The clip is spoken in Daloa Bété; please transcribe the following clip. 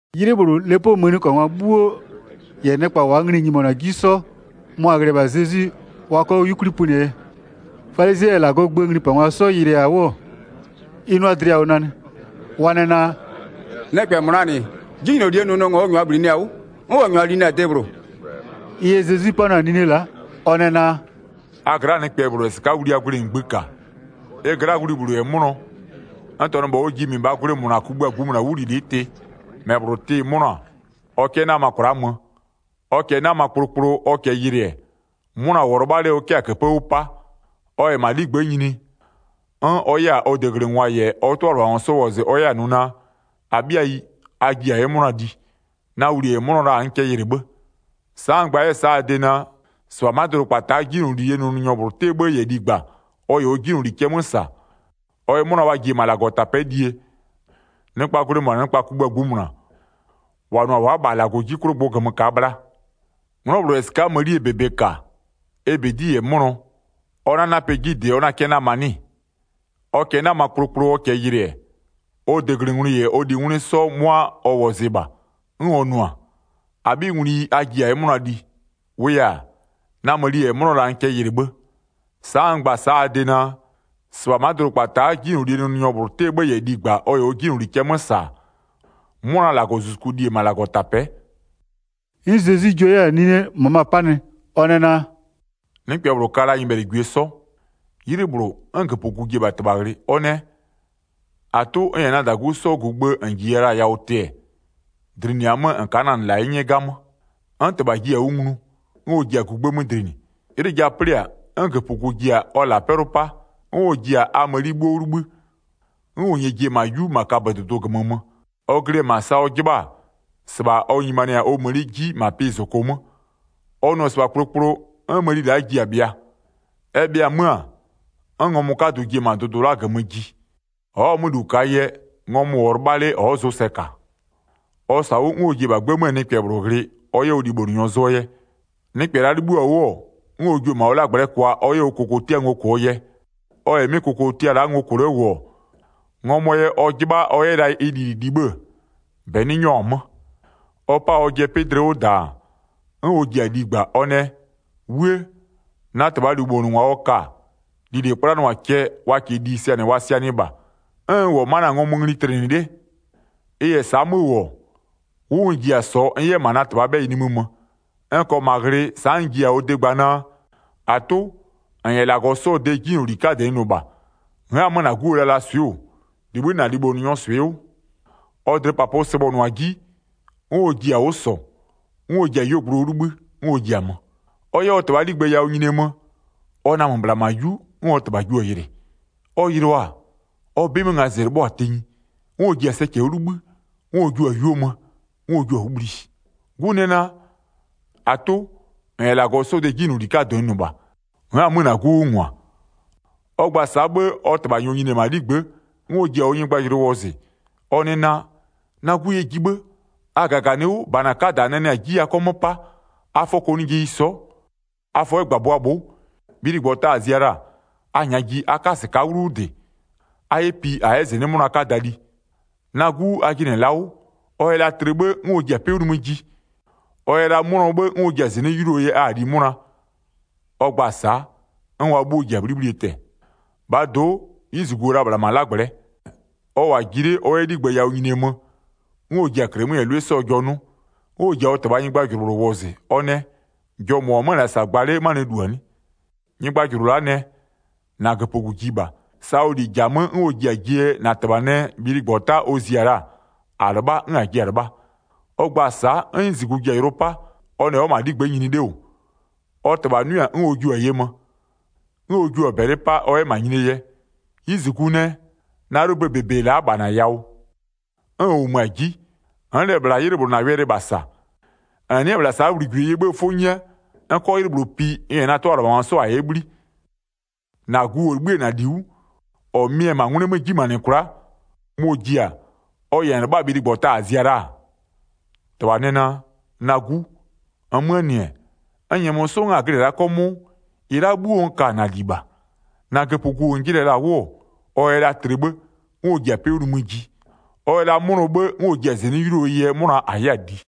'Ylɩ -bhlʋ, 'lepoo mëniköbhangwa 'bhuo -yɛ nɩkpa -waa nglɩ-ɩ 'nyimonʋ-a 'ji 'sɔ, mʋa-a ghlɩ-ɛ -bha Zezwi wa 'kɔ 'yukwli pönɩɛ yɛ. Falizɩɛ -yɛ -Lagɔɔ gböö nglipangwa 'sɔ yɩlɩɩ-a 'wʋ, ɩ 'nʋa dlɩ yawʋ nanɩ. Wa nɛ naa: “Nɩkpɛ -mɔ -laa -nɩ, 'jinylolie nʋnʋngwa ɔ -nyʋa bhlinɩ-a 'wʋ, 'n ɔ -nyʋa linɩ-a debhlʋ.” Ɩ yɛ Zezwi 'panʋa-a 'nine la'a, ɔ nɛ naa: “A gla'aa nɩkpɛ -bhlʋ -yɛ -sɩka'a wlia gwlɩ -ngbï -ka, ɩ gla'aa wli -bhlʋ -yɛ 'mʋnɔ, n -tɔnʋ -bha ɔ ji -mɩbhaa gwlɩ -mʋna kugbïa -ngbïmʋna 'wʋlilɩ'ɩ tɩ, -mɛ -bhlʋ 'tɩ-ɩ 'mʋnɔ-a, ɔ 'kɛ 'nama kwla'a mö? Ɔ -kɛɛ 'nama kplokplo, ɔ -kɛɛ yɩlɩ-ɛ, 'mʋna -wʋɔ 'lɩbha 'le ɔ 'kɛ-a -këpë 'wʋ 'pa, ɔ -yɛ -ma ɔ 'ligbë'ë nyini, 'n ɔ 'yɛ-a ɔ deglɩngwa -yɛ ɔ 'tʋalɩbhangwa 'sɔ wɔzɩ ɔ 'yɛ-a nʋ naa: -Abhɩayi, a ji -a 'yɛ 'mʋna li, na wli -ɛ 'mʋnɔ la-a n kɛ yɩlɩ 'bhë. Sa'a n gba-a a de naa: -Sɩbha ma'a dʋdʋkpata'a 'jinylolie nʋnʋnyɔ -bhlʋ 'tɩɛ 'bhë -yɛ ligba ɔ -yɛ ɔ 'jinyloli cɛ 'mö -sa, ɔ yɛ 'mʋna wa ji-e -ma -Lagɔtapɛ'ɛ lie, nɩkpaa gwlɩ -mʋna nɩkpa kugbïa -ngbïmʋna, -wa nʋ-a wa'a -bha -Lagɔɔ 'ji 'klʋ gbʋ -gömö -kaa bhla. 'Nglɔ -bhlʋ -yɛ -sɩka'a mënie -bebe -ka, ɛ -bedi -yɛ 'mʋnɔ, ɔ 'na 'napɛ 'ji -dɩ ɔ 'na 'kɛ 'nama 'nɩ-ɩ? Ɔ -kɛɛ 'nama kplokplo, ɔ -kɛɛ yɩlɩ-ɛ, ɔ deglɩngwlɩ -yɛ ɔ lingwlɩ 'sɔ 'mʋa ɔ wɔzɩ -bha, 'n ɔ nʋ-a: -Abhingwlɩyi a ji -a 'yɛ 'mʋna li. -Wʋʋ yɛ-a, na mëni -ɛ 'mʋnɔ la-a n kɛ yɩlɩ 'bhë. Sa'a n gba-a sa'a a de naa: -Sɩbha ma'a dʋdʋkpata'a 'jinylolie nʋnʋnyɔ -bhlʋ 'tɩɛ 'bhë -yɛ ligba ɔ -yɛ ɔ 'jinyloli cɛ 'mö -sa-a, 'mʋna -Lagɔzuzuku li-e -ma -Lagɔtapɛ'ɛ.” 'N Zezwi jua 'yɛ-a nine -möma 'panɩ, ɔ nɛ naa: “Nɩkpɛ -bhlʋ ka la-a nyɩbhɛlɩgwie 'sɔ. 'Ylɩ -bhlʋ, 'n -göpögu ji-e -bha -tɩbha ghlɩ, ɔ nɛ: -Atʋ, n -yɛ na -dagu 'sɔɔ gugbë -n -jiya la-a yawʋ tɩɛ, dlinɩa 'mö -n ka'a na -nɩ -la 'ye 'nyɛ 'gamö. 'N -tɩbha jiɩ-a 'wʋ nglu, 'n ɔ ji-a gugbë 'mö dlinɩ. 'Ylɩ ja 'plɩ-a, 'n -göpögu ji-a ɔ -la 'pɛlʋ 'pa, 'n ɔ ji-a a mëni 'bhuo 'wʋ 'libhï, 'n ɔ -nyɛɛ ji-e -ma 'yu -ma kabödʋdʋ -gömö mö. Ɔ glɩ-ɛ -ma sa ɔ 'jɩbha-a, -sɩbha ɔ nyimanɩ-a ɔ mëni la'a 'ji -ma pɩ -zoko 'mö. Ɔ nʋ-ɔ -sɩbha kplokplo, 'n mëni la'a ji-a bhɩa. Ɛ bhɩa 'mö-a, 'n ngɔmʋ 'kadʋ ji-e -ma dʋdʋ la'a -gömö ji. Ɔ'ɔ-a 'mö -lu -kaa yɛ, ngɔmʋ -wʋɔ 'lɩbha 'le ɔ'ɔ zʋsɛ -ka. Ɔ -sɔ-a 'wʋ 'n ɔ ji-e -bha 'gbë 'möö nɩkpɛ -bhlʋ ghlɩ ɔ 'yɛ ɔ libhonʋnyɔ zʋɔ yɛ. Nɩkpɛ la'a 'libhïɔ-a 'wʋ-ɔ, 'n ɔ jio-o -ma ɔ 'lagblɛ'ɛ kwa ɔ 'yɛ ɔ kokotia ngo -kʋɔ yɛ. Ɔ -yɛ 'mɩ kokotia la'a ngo -kʋ 'le -wʋ-ɔ, ngɔmʋɔ yɛ ɔ 'jɩbha ɔ 'yɛ la ɩ lili li 'bhë-ë, -bɛ 'nɩ 'nyɔ-a 'mö. Ɔ pa-a ɔjɩɛ 'pɩ dlɩ 'wʋ -daan, 'n ɔ ji-a ligba, ɔ nɛ: 'Wuë! Na -tɩbhaa libhonʋngwa ɔ ka-a, lili 'kplanʋa-a cɛ, wa -kɩɩ li sɩanɩ wa sɩanɩɩ -bha, 'n n -wʋ-ɔ la'a ma'a na-a ngɔmʋ ngli tlɩnɩ 'le. Ɩ -yɛ sa'a 'mö -wʋ-ɔ, 'wʋ n ji-a -sɔɔ n 'yɛ -ma na -tɩbhaa 'bhɛyɩ nimï mö. N -kɔɔ -ma ghlɩ, sa'a n ji-a ɔ de gba naa: -Atʋ, -n -yɛ -Lagɔ 'sɔɔ de 'jinyloli 'kadɩ n nʋ -bha. N'n-a 'mö -na 'guo lalaswɩ'ɩ -wʋ, -libhï'ï -na libhonʋnyɔɔ swɩ'ɩ 'wʋ. Ɔ dlɩpapʋ sɩbhɔnʋ-a 'ji, 'n ɔ ji-a 'wʋ -sɔ, 'n ɔ ji-a 'yuogblʋ 'wʋ 'libhï, 'n ɔ ji-a mö. Ɔ 'yɛ ɔ -tɩbhaa 'ligbë yawʋ nyinie mö, ɔ namö -bhla -ma 'yu, 'n -tɩbha jio-a yɩlɩ. Ɔ yɩlɩɔ-a, ɔ 'bɩ 'mö ngazɩ 'lɩbhɔ-a tenyi. 'N ɔ ji-a sɛcɛ 'wʋ 'libhï, 'n ɔ jio-a 'yuo mö, 'n ɔ jio-a 'wʋ bhli. 'Gu nɛ naa: -Atʋ, -n -yɛ -Lagɔ 'sɔɔ de 'jinyloli 'kadɩ n nʋ -bha. N'n-a 'mö -na 'gu 'wʋ -ngwa. Ɔ gba-a sa'a 'bhë, ɔ -tɩbha -nyɔɔ nyini-e -ma 'ligbë'ë, 'n ɔ ji-a ɔ nyɩgbajʋlʋɩ wɔzɩ, ɔ nɛ naa: Na 'gu yɛ ji 'bhë, a -gaganɩ 'wʋ, -bana 'kada -a nanɩ-a 'ji a 'kɔ 'mö 'pa, a fɔ kɔnɩjeyi sɔ'ɔ, a fɔ 'yɛ -gbabʋa bhʋ'ʋ. Bhiligbɔta la'a -a zia la-a, a -nyaa ji a 'ka -sɩka'a 'wlu 'wʋ -dɩ, a 'yɛ pi -a 'yɛ -zɩnɩ'ɩ 'mʋna 'kada li. Na 'gu a jɩnɩ-ɛ la'a 'wʋ, ɔ yɛ la tlɩ 'bhë 'n ɔ ji-a 'pɩ 'wʋ nimï ji, ɔ yɛ la 'mʋnɔ 'bhë 'n ɔ ji-a -zɩnɩ'ɩ 'yuluoo yɛ a-a li 'mʋna. Ɔ gba-a sa'a, 'n wa 'bhuo ji-a 'bhlibhlie tɛ-ɛ. 25-Bhaa do'o, 'yiziguo-o la -bhla -ma 'lagblɛ'ɛ. Ɔ -wʋ-a ji 'le, ɔ 'yɛ 'ligbë yawʋ nyinie mö, 'n ɔ ji-a -klɩmö -yɛ 'lʋɩ 'sɔɔ jɔ 'nʋ. 'N ɔ ji-a ɔ -tɩbhaa nyɩgbajʋlʋ -bhlʋ wɔzɩ, ɔ nɛ: Jɔ -mʋ -wʋ-ɔ 'mö-ö -sa gba 'le 'manɩɛ -lu-a 'nɩ? Nyɩgbajʋlʋ la'a nɛ: -Na -göpögu ji -bha, sa ɔ -li -ja-a 'mö 'n ɔ ji-a jie yɛ -na -tɩbha nɛ bhiligbɔta ɔ zia la-a, -a 'lɩbha 'n -a jia-a 'lɩbha. Ɔ gba-a sa'a, 'n ɔ 'yizigu ji-a yʋlʋ 'pa, ɔ nɛ ɔ'ɔ -ma 'ligbë'ë nyini 'le -wʋ. Ɔ -tɩbha 'nʋɩ-a 'n ɔ jio-a ye mö, 'n ɔ jio-a -bɛlɩ 'pa, ɔ 'yɛ -ma nyinie yɛ. 'Yizigu nɛ: Na 'ylʋböö -bebe-e la'a -bha -na yawʋ, 'n n -wʋmö-a 'ji, n'n -lɛ -bhla 'ylɩ -bhlʋ -na wɛlɩ -bha -sa. -N nɩ'ɩ-ɛ -bhla sa'a wligwileyie 'bhëë 'fʋ 'nyɛ, n 'kɔ 'ylɩ -bhlʋ pi n -yɛ na 'tʋalɩbhangwa 'sɔ 'yɛ 'bhli. 30-Na gu -ɔ 'libhï la-a -na -li 'wʋ, -ɔ mɩ-ɛ -ma 'ngwlɩ 'mö 'ji nyimanɩ kwla'a, mɔ-ɔ ji-a, ɔ yɛ -n lɩbha-a bhiligbɔta -a zia la-a? 31-Tɩbha nɛ naa: Na 'gu, -nmöö -nɩ-ɛ, n -nyɛmö 'sɔ 'n -a glɩ-ɛ la'a 'kɔmʋʋ, -ɩ la'a 'bhuo n ka-a -na -li -bha. 32-Na -göpögu -n jɩnɩ-ɛ la'a 'wʋ-ɔ, ɔ yɛ la tlɩ 'bhë, 'n ɔ ji-a 'pɩ 'wʋ nimï ji, ɔ yɛ la 'mʋnɔ 'bhë, 'n ɔ ji-a -zɩnɩ'ɩ 'yuluoo yɛ 'mʋna -a 'yɛ-a li.”